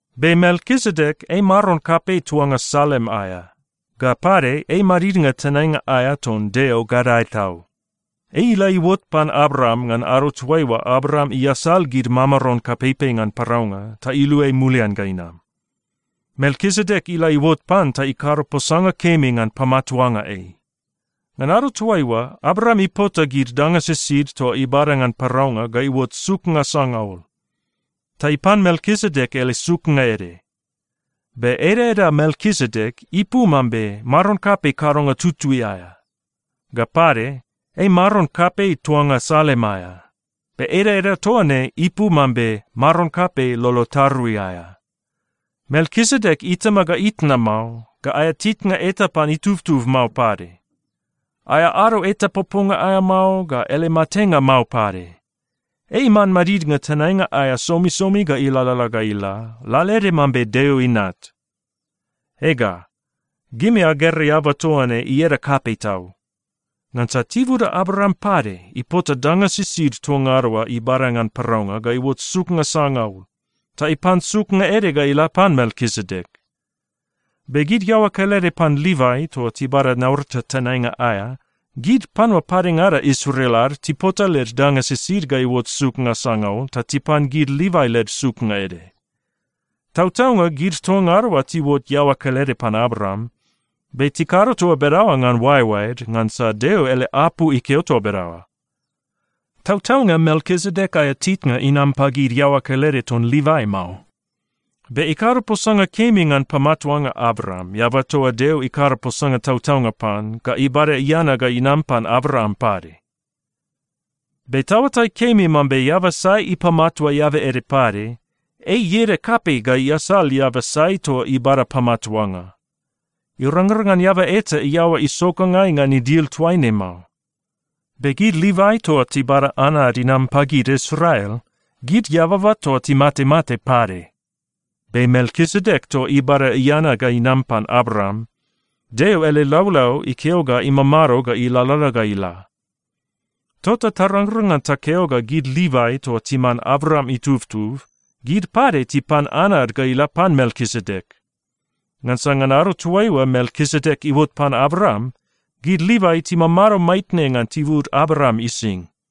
Be Melkisedek ei maron kapei tuanga Salem aea. Ga pade, ei madidnga tenainga aea ton Deo Gadae Tau. Ei ila iuot pan Abraam ngan ado toaiua Abraam iasal gid mamaron kapeipei ngan paraunga ta iluai mulian ga inam. Melkisedek ila iuot pan ta ikado posanga kemi ngan pamatuanga ei. Ngan ado toaiua, Abraam ipota gid danga sisid toa ibada ngan paraunga ga iuot suknga sangaul. Ta ipan Melkisedek ele suknga ede. Be edaeda Melkisedek ipu mambe “maron kapei kadonga tutui aea.” Ga pade, ei maron kapei tuanga Salem aea. Be edaeda toa ne ipu mambe “maron kapei lolo tarui aea.” Melkisedek itama ga itna mao, ga aea titnga eta pan itubtub mao pade. Aea ado eta poponga aea mao, ga ele matenga mao pade. Ei iman madidnga tenainga aea somisomi ga ilalala ga ila, lalaede mambe Deo Inat. Ega, gimi agera eaba toa ne ieda kapei tau. Ngansa tibuda Abraam pade ipota danga sisid toa ngada oa ibada ngan paraunga ga iuot suknga sangaul. Ta ipan suknga ede ga ila pan Melkisedek. Be gid iaoa kelede pan Livai toa tibada naurata tenainga aea, gid panua padengada Israel ad tipota led danga sisid ga iuot suknga sangaul ta tipan gid Livai led suknga ede. Tautaunga gid toa ngada oa tiuot iaoa kelede pan Abraam, be tikado toa bedaoa ngan oaeoaed, ngansa Deo ele apu ikeo toa bedaoa. Tautaunga Melkisedek aea titnga inam pagid iaoa kelede ton Livai mao, be ikado posanga kemi ngan pamatuanga Abraam, eaba toa Deo ikado posanga tautaunga pan, ga ibada iana ga inam pan Abraam pade. Be taoatai kemi mambe eaba sai ipamatua eaba ede pade, ei ieda kapei ga iasal eaba sai toa ibada pamatuanga. Irangrang ngan eaba eta iaoa isokangai ngan idil toaine mao. Be gid Livai toa tibada anad inam pagid Israel, gid eababa toa timatemate pade. Be Melkisedek toa ibada iana ga inam pan Abraam, Deo ele laulau ikeo ga imamado ga ilalala ga ila. Tota tarangrang ngan takeo ga gid Livai toa timan Abraam itubtub, gid pade tipan anad ga ila pan Melkisedek. Ngansa ngan ado toaiua Melkisedek iuot pan Abraam, gid Livai timamado maitne ngan tibud Abraam ising.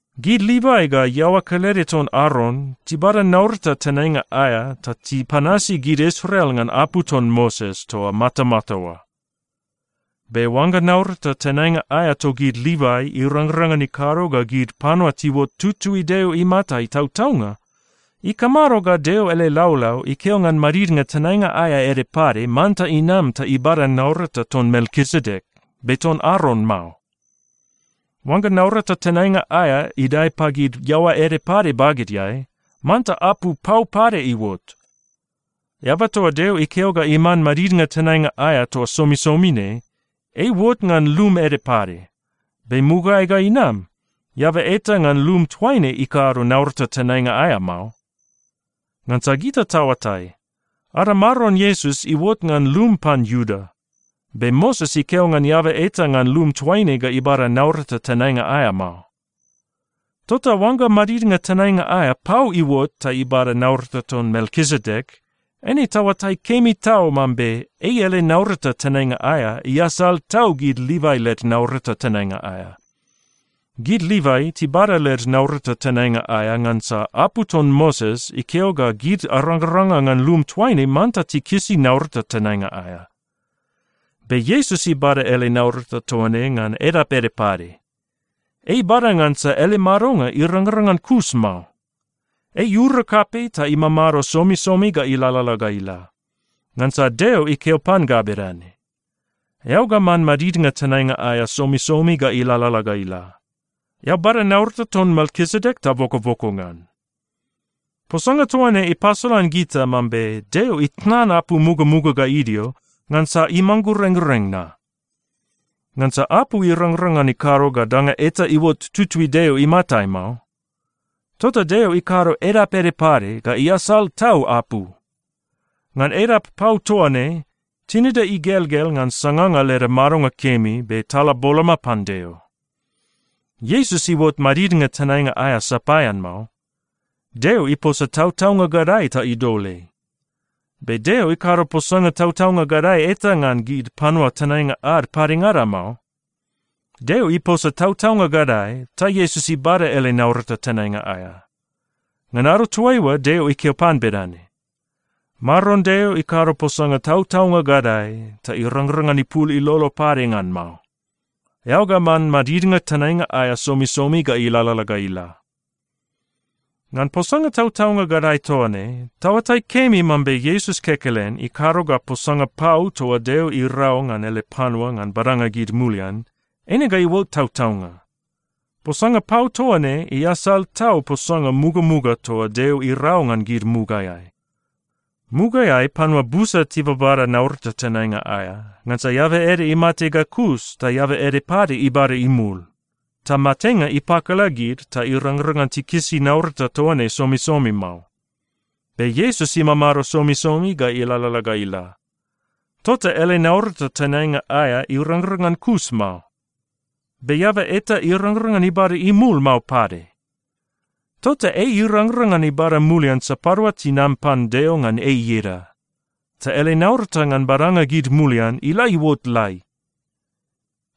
Gid Livai ga iaoa kelede ton Aron tibada naurata tenainga aea ta tipanasi gid Israel ngan apu ton Moses toa matamata oa. Be oangga naurata tenainga aea togid Livai irangrang ngan ikado ga gid panua tiuot tutui Deo imatai tautaunga, ikamado ga Deo ele laulau ikeo ngan madidnga tenainga aea ede pade manta inam ta ibada naurata ton Melkisedek, be ton Aron mao? Oangga naurata tenainga aea idae pagid iaoa ede pade bagedeai, manta apu pau pade iuot. Eaba toa Deo ikeo ga iman madidnga tenainga aea toa somisomi ne, ei iuot ngan lum ede pade. Be mugaeai ga inam, eaba eta ngan lum toaine ikado naurata tenainga aea mao. Ngansa gita taoatai, ada Maron Iesus iuot ngan lum pan Iuda. Be Moses ikeo ngan eaba eta ngan lum toaine ga ibada naurata tenainga aea mao. Tota oangga madidnga tenainga aea pau iuot ta ibada naurata ton Melkisedek, eine taoatai kemi tau mambe ei ele naurata tenainga aea iasal tau gid Livai led naurata tenainga aea. Gid Livai tibada led naurata tenainga aea ngansa apu ton Moses ikeo ga gid arangaranga ngan lum toaine manta tikisi naurata tenainga aea. Be Iesus ibada ele naurata toa ne ngan edap ede pade. Ei ibada ngansa ele madonga irangrang ngan kus mao. Ei iura kapei ta imamado somisomi ga ilalala ga ila. Ngansa Deo ikeo pan ga bedane, “Eao ga man madidnga tenainga aea somisomi ga ilalala ga ila. Eao bada naurata ton Melkisedek ta bokoboko ngan.” Posanga toa ne ipasolan gita mambe Deo itnan apu mugamuga ga idio ngansa imanggurenggureng na. Ngansa apu irangrang ngan ikado ga danga eta iuot tutui Deo imatai mao. Tota Deo ikado edap ede pade ga iasal tau apu. Ngan edap pau toa ne, tinida igelgel ngan sanganga leda madonga kemi, be tala boloma pan Deo. Iesus iuot madidnga tenainga aea sapaean mao. Deo iposa tautaunga gadae ta idol ei. Be Deo ikado posanga tautaunga gadae eta ngan gid panua tenainga ad padengada mao. Deo iposa tautaunga gadae, ta Iesus ibada ele naurata tenainga aea. Ngan ado toaiua, Deo ikeo pan bedane, “Maron Deo ikado posanga tautaunga gadae, ta irangrang ngan ipul ilolo pade ngan mao. ‘Eao ga man madidnga tenainga aea somisomi ga ilalala ga ila.’” Ngan posanga tautaunga gadae toa ne, taoatai kemi mambe Iesus kekelen ikado ga posanga pau toa Deo irau ngan ele panua ngan badanga gid mulian, eine ga iuot tautaunga. Posanga pau toa ne iasal tau posanga mugamuga toa Deo irau ngan gid mugaeai. Mugaeai panua busa tibabada naurata tenainga aea, ngansa eaba ede imate ga kus ta eaba ede pade ibada imul. Ta matenga ipakala gid ta irangrang ngan tikisi naurata toa ne somisomi mao. Be Iesus imamado somisomi ga ilalala ga ila. Tota ele naurata tenainga aea irangrang ngan kus mao, be eaba eta irangrang ngan ibada imul mao pade. Tota ei irangrang ngan ibada mulian sapadua tinam pan Deo ngan ei ieda, ta ele naurata ngan badanga gid mulian ila iuot lai.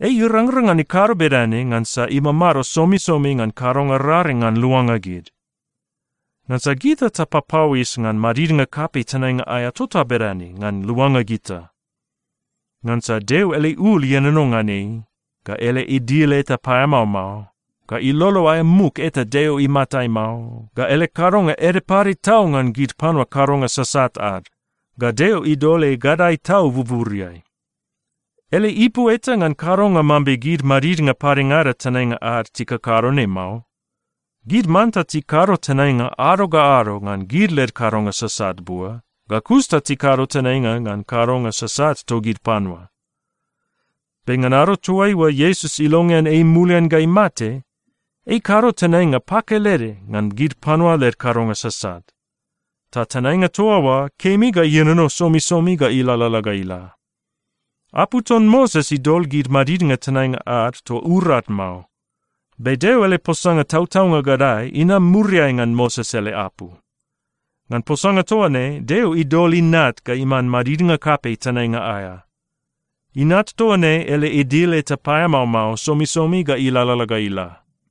Ei irangrang ngan ikado bedane ngansa imamado somisomi ngan kadonga raring ngan luanga gid. Ngansa gita tapapauis ngan madidnga kapei tenainga aea tota bedane ngan luanga gita. Ngansa Deo ele ul ienono ngan ei, ga ele idil eta paeamao mao, ga ilolo aea muk eta Deo imatai mao, ga ele kadonga ede pade tau ngan gid panua kadonga sasat ad, ga Deo idol ei gadae tau buburiai. Ele ipu eta ngan kadonga mambe gid madidnga padengada tenainga ad tikakado ne mao. Gid manta tikado tenainga ado ga ado ngan gid led kadonga sasat bua, ga kus ta tikado tenainga ngan kadonga sasat togid panua. Be ngan ado toaiua Iesus ilongean ei mulian ga imate, ei ikado tenainga pakelede ngan gid panua led kadonga sasat. Ta tenainga toa oa kemi ga ienono somisomi ga ilalala ga ila. Apu ton Moses idol gid madidnga tenainga ad toa urad mao. Be Deo ele posanga tautaunga gadae inam muriai ngan Moses ele apu. Ngan posanga toa ne, Deo idol Inat ga iman madidnga kapei tenainga aea. Inat toa ne ele idil eta paeamao mao somisomi ga ilalala ga ila.